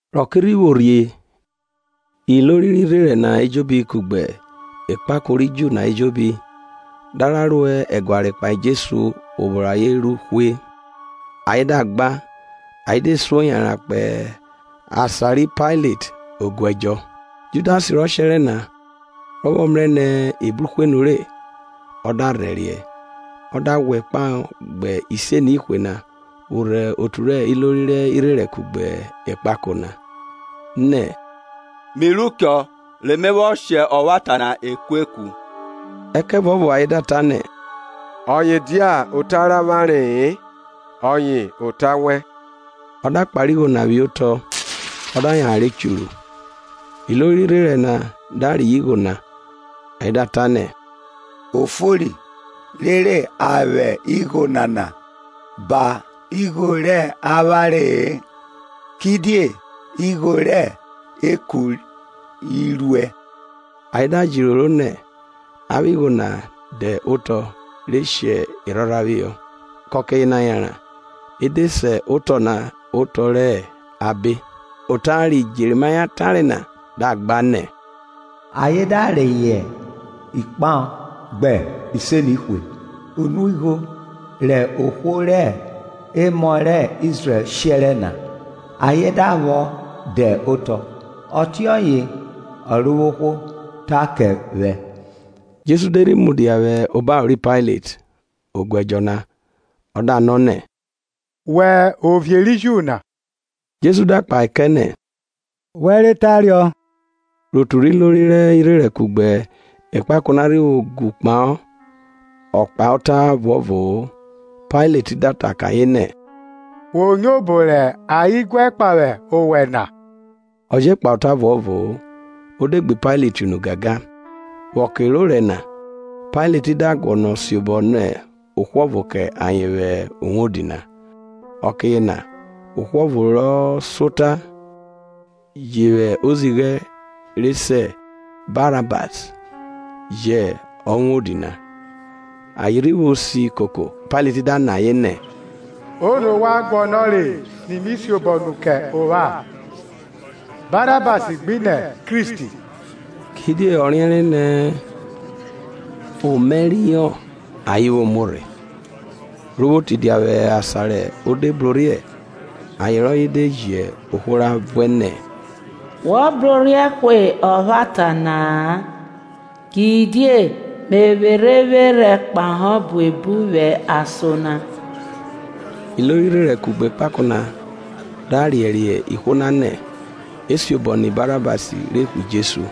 Rẹ ọke rhi vwo rhie, ilori rẹ irherẹn na ejobi kugbe ekpako ri Ju na ejobi, da ra ro ẹguare kpahe Jesu obo rẹ ayen ru hwe. Ayen da gba, ayen de suo yanran kpo asan ri Pailet oguẹdjọ na. Judas rọ shẹrẹ na, rọ vwọ mrẹ nẹ e bruhwe nure, o de kurhẹriẹ, ọ da ghwẹ idọnọ efuanfon ọgban na vwo rhe otu rẹ ilori rẹ irherẹn kugbe ekpako na, nẹ, Mi ru chọ, re me vwọ shẹ ọvwata na ekueku. Ẹkẹvuọvo ayen da ta nẹ, ọye dia ota rẹ avwanre-e, ọye ota wẹn. Ọ da kpare igho na phihọ otọ, ọ da yanran re churu ghwu. Ilori rẹ irherẹn na da reyọ igho na, ayen da ta nẹ, Ofori rere a vwẹ igho nana ba igho rẹ avwanre-e, kidie igho rẹ ọbara i ruẹ. Ayen da jẹ iroro nẹ, a vwẹ igho na dẹ otọ re shi erhorha phihọ. Kẹ ọke yena yanran e de se otọ na Otọ rẹ Obara. Ota ri Jẹrimaya tare na da gba nẹ, Ayen da reyọ idọnọ efuanfon ọgban na, unuigho rẹ emọ rẹ Izrẹl shẹrẹ na. Ayen da vwọ de otọ, ọtiọye Ọrovwohwo ta kẹ vwẹ. Jesu de rhi mudia vwẹ obaro ri Pailet oguẹdjọ na, ọ da nọ nẹ, Wẹ hẹ ovie ri Ju na? Jesu da kpahe kẹ nẹ, Wẹ re tare. Rẹ otu rẹ ilori rẹ irherẹn kugbe ekpakọ na rhi vwo gu kpahọ ọ kpahe ota ọvuọvo-o. Pailet da ta kẹ ayen nẹ, Wo nyo obo rẹ ayen guẹ kpahe owẹ na? Ọ je kpahe ota ọvuọvo-o; o de gbe Pailet unu gangan. Vwẹ ọke orẹ na, Pailet da guọnọ siobọ nẹ ohwo ọvo kẹ ayen vwẹ uwodi na. Ọke yena ohwo ọvo rọ suota, ji vwẹ ozighẹ re se Barabas je hẹ uwodi na. Ayen rhi vwo si koko, Pailet da nọ ayen nẹ, Ono wa guọnọre ni mi siobọ nu kẹ ovwan? Barabas gbenẹ Kristi? Kidie ọ riẹnre nẹ omaẹriọ ayen vwo muo rhe. Ro vwo tidia vwẹ asan re de brorhiẹ, aye rọye de ji ohwo ra vuẹ nẹ, Wo brorhiẹ hwe ọvwata na-a; Kidie me vwerhẹ evwerhẹ kpahọ buebu vwẹ ason na. Ilori rẹ irherẹn kugbe ekpako na da riẹriẹ ihwo na nẹ, e siobọ nẹ Barabas re hwe Jesu.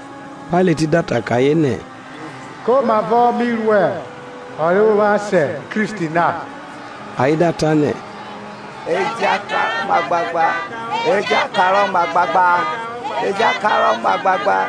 Pailet da ta kẹ ayen nẹ, Komavọ mi ru ọ rẹ ovwan se Kristi na? Ayen da ta nẹ, e ja karọ mu agbagba.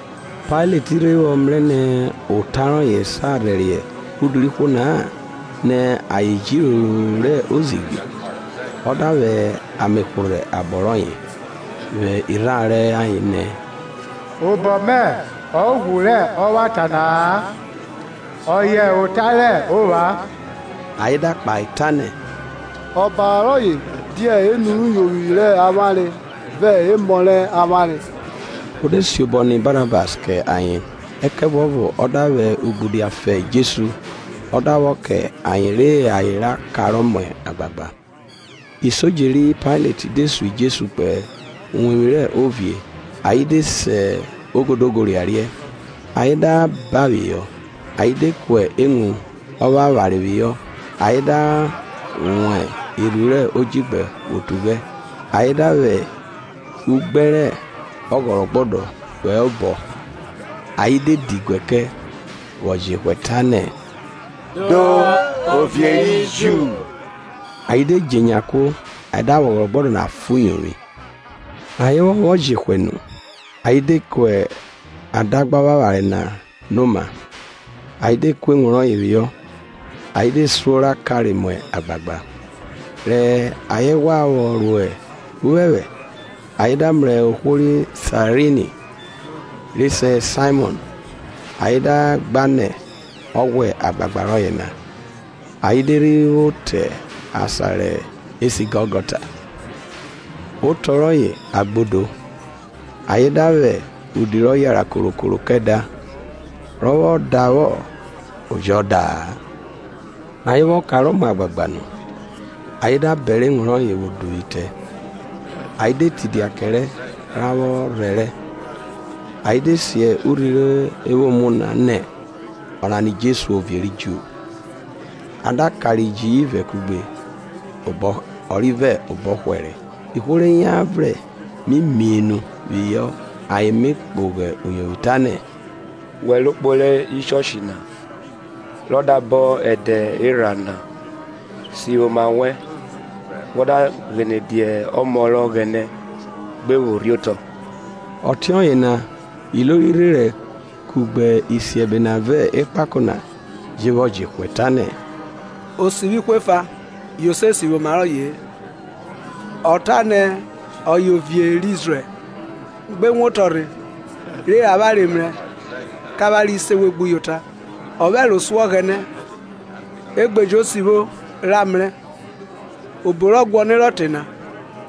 Pailet rhe vwọ mrẹ nẹ ota rọye sa rhẹriẹ udu rẹ ihwo na-a nẹ ayen jẹ iroro rẹ ozighi, ọ da vwẹ ame hworhẹ obọ rọye vwẹ irharo rẹ ayen nẹ, Obọ mẹ hẹ ughwu rẹ ọvwata nana-a, ọye ota rẹ ovwan. Ayen da kpahe ta nẹ, Ọbara rọye dia enu rẹ uyovwi rẹ avwanre vẹ emọ rẹ avwanre. O de siobọ nẹ Barabas kẹ ayen, ẹkẹvuọvo ọ da vwẹ ugbudia fa Jesu ọ da vwọ kẹ ayen re ayen ra karọ mu agbagba. Isodje ri Pailet de sun Jesu kpo uwevwi rẹ ovie, ayen de se ogodogo riariẹ, Ayen da ban phihọ, ayen de ku ewun ovwavware phihọ. Ayen da wọn erhu rẹ odjigbẹ vwo tughẹ, ayen da vwẹ ugbẹn rẹ ọghọrọghọdẹ vwọ hẹ obọ; ayen de diguẹ kẹ, vwọ jehwẹ tanẹ, Do, Ovie ri Ju! Ayen de dje enya kuo, ayen da vwẹ ọghọrọgbọdẹ na fa uyovwi. Rẹ ayen vwọ reyọ vwọ jehwẹ nu, ayen de ku adagba ọvwavware na no oma, ayen de ku ewun rọye phihọ, ayen de suo ra kare mu agbagba. Rẹ ayen ghwa vwọ ro uphẹphẹ, ayen da mrẹ ohwo ri Saerini, re se Saimọn, ayen da gba nẹ ọ ghwa agbagba rọye na. Ayen de rhi vwo te asan re se Gọlgọta, otọ rọye, ekpehruyovwi. Ayen da vwẹ udi rọ yara korokoro kẹ, rọ vwọ davwọ o jọ da-a. Rẹ ayen vwọ karọ mu agbagba nu, ayen da bẹrẹ ewun rọye vwo duvwu itẹ. Ayen de tidia kẹrẹ ra vwọ rhẹrẹ. Ayen de si urhi re vwo muo nẹ, ỌNANA JESU OVIE RI JU. A da kare iji ivẹ kugbe, ọvo hẹ obọrhe ọrivẹ hẹ obọhwẹre. Ihwo re yan vrẹn mi mienu phihọ ayen mi kpogho uyovwi, tanẹ Wẹ ro kporo uwevwi rẹ ẹga na, rọ da bọn ẹdẹ erha na, sivwi oma wẹn, wọ da ghene dia ọmọ rẹ Ọghẹnẹ gbe pho rhiotọ. Ọtiọye na, ilori rẹ irherẹn, kugbe isiẹbe na vẹ ekpako na je vwọ jehwẹ tanẹ, Ọ sivwi ihwo efa; yo se sivwi oma rọye-e. Ọ ta nẹ, ọye hẹ ovie rẹ Izrẹl; gbe wotọ rhe re avwanre mrẹ, kẹ avwanre se we gbuyota. Ọ vwẹ ẹro so Ọghẹnẹ; e gbe jo sivwo ra mrẹ, obo rọ guọnerọ te na;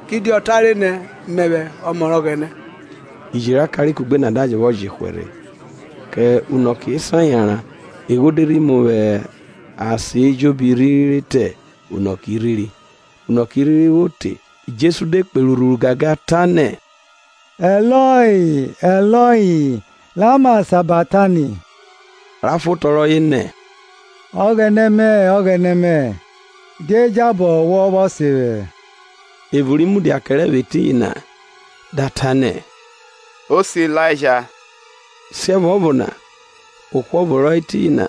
kidie ọ tare nẹ, Mẹvwẹ ọmọ rẹ Ọghẹnẹ. Iji ra kare kugbe na da je vwọ jehwẹ rhe. Kẹ unọke esan yanran egho de rhi mu vwẹ asan ejobi rhiri rhi te unọke irhiri. Unọke irhiri vwo te Jesu de kperi urhuru gangan ta nẹ, Eloi, Eloi lama sabaktani? ra fan otọ rọye nẹ, Ọghẹnẹ mẹ, Ọghẹnẹ mẹ, die jabọ wọ vwọ sen vwẹ? Evo ri mudia kẹrẹ vwẹ etiyin na da ta nẹ, o se Ilaija. Siẹvuọvo na ohwo ọvo rọ hẹ etiyin na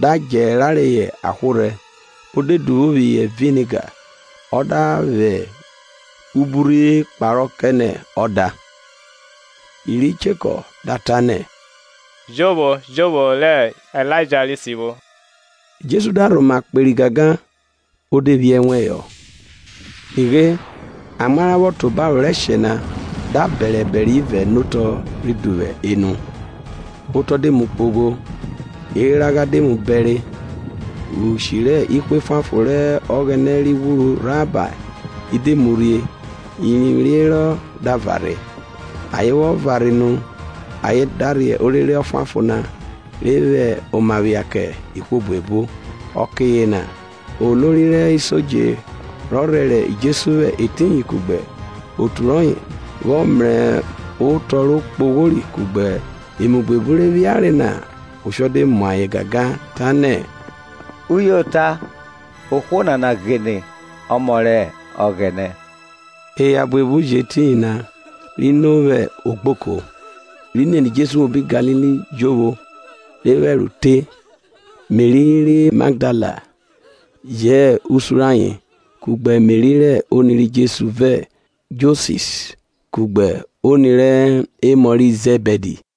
da djẹ ra reyọ ahworhẹ, o de duvwo phihọ viniga, ọ da vwẹ ubiurhe kparọ kẹ nẹ ọda. Iri cheko da ta nẹ, Jo vwo re Ilaija rhi sivwo. Jesu da rhoma kperi gangan, o de phi ẹnwẹn họ. Nighe amwa ra vwọ tan obaro rẹ ẹshẹ na, da bẹre ẹbẹre ivẹ nẹ otọ rhi duvwu enu; otọ de mu kpogho; eragha de mu bẹre. Ishi rẹ ihwo efuanfon rẹ Ọghẹnẹ ri ghwuru rhabae de mu rhie, irivwi re herọ da varhe; Ayen vwọ varhe nu, ayen da rhe orere Ọfuanfon na re vwẹ oma phia kẹ ihwo buebu. Ọke yena olori rẹ isodje rọ rhẹrẹ Jesu vwẹ etiyin, kugbe otu rọye, vwọ mrẹ otọ re kpoghori, kugbe emu buebu re phiare na, oshọ de mu ayen gangan ta nẹ, Uyota ohwo nana ghine ọmọ rẹ Ọghẹnẹ. Eya buebu je hẹ etiyin ri no vwẹ ogboko, iri nene Jesu vwẹ obi Galili jovwo, re vwẹ ẹro te. Meri ri Magdala je hẹ usun rẹ ayen, kugbe Meri rẹ oni ri Jems vi Josis kugbe oni rẹ emọ ri Zẹbidi.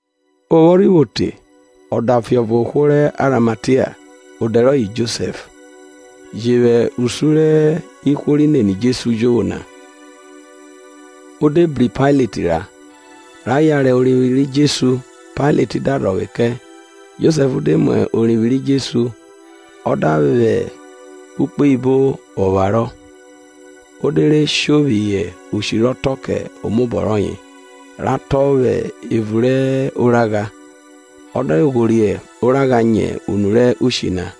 Ovwọnvwọn rhi vwo te, ọdafe ọvo ohwo rẹ Arimatia, odẹ rọye Josẹf, je vwẹ usun rẹ ihwo ri nene Jesu jovwo na. O de bru Pailet ra, ra yare orivwi ri Jesu. Pailet da rhọvwe kẹ. Josẹf de mu orivwi ri Jesu, ọ da vwẹ ukpoyibo vwọ pharọ. O de re sho vwẹ ushi rọ tọn kẹ omobọ rọye, rọ tọn phihọ evun rẹ oragha, o de ghorie oragha nyẹ unu rẹ ushi na.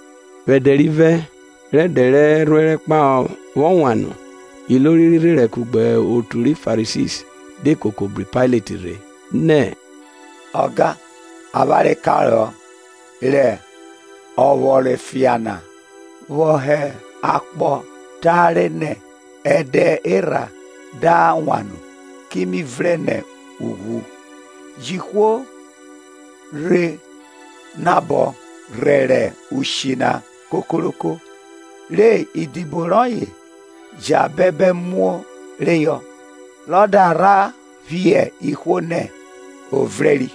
Vwẹ ẹdẹ rivẹ, rẹ ẹdẹ rẹ Erhuẹrẹ kpahọ vwọ wan nu, ilori rẹ irherẹn kugbe otu ri Farisi de koko bru Pailet rhe. Nẹ, Ọga, avwanre karohọ rẹ ọvworofian na, vwọ hẹ akpọ tare nẹ, Ẹdẹ erha da wan nu ki mi vrẹn nẹ ughwu. Ji ihwo re nabọ rhẹrẹ ushi na kokoroko, re idibo rọye vwo jẹ bẹbẹ muo reyọ, re ayen da rhe phiẹn ihwo nẹ, Ọ vrẹnri;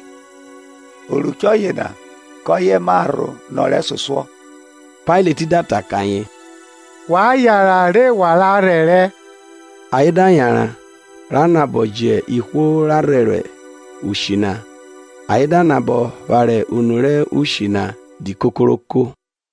oruchẹ yena kọye ma rho nọ ọ rẹsosuọ. Pailet da ta kẹ ayen, wa yanran re wa ra rhẹrẹ. Ayen da yanran, ra nabọ ji ihwo ra rhẹrẹ ushi na, ayen da nabọ phare unu rẹ ushi na di kokoroko.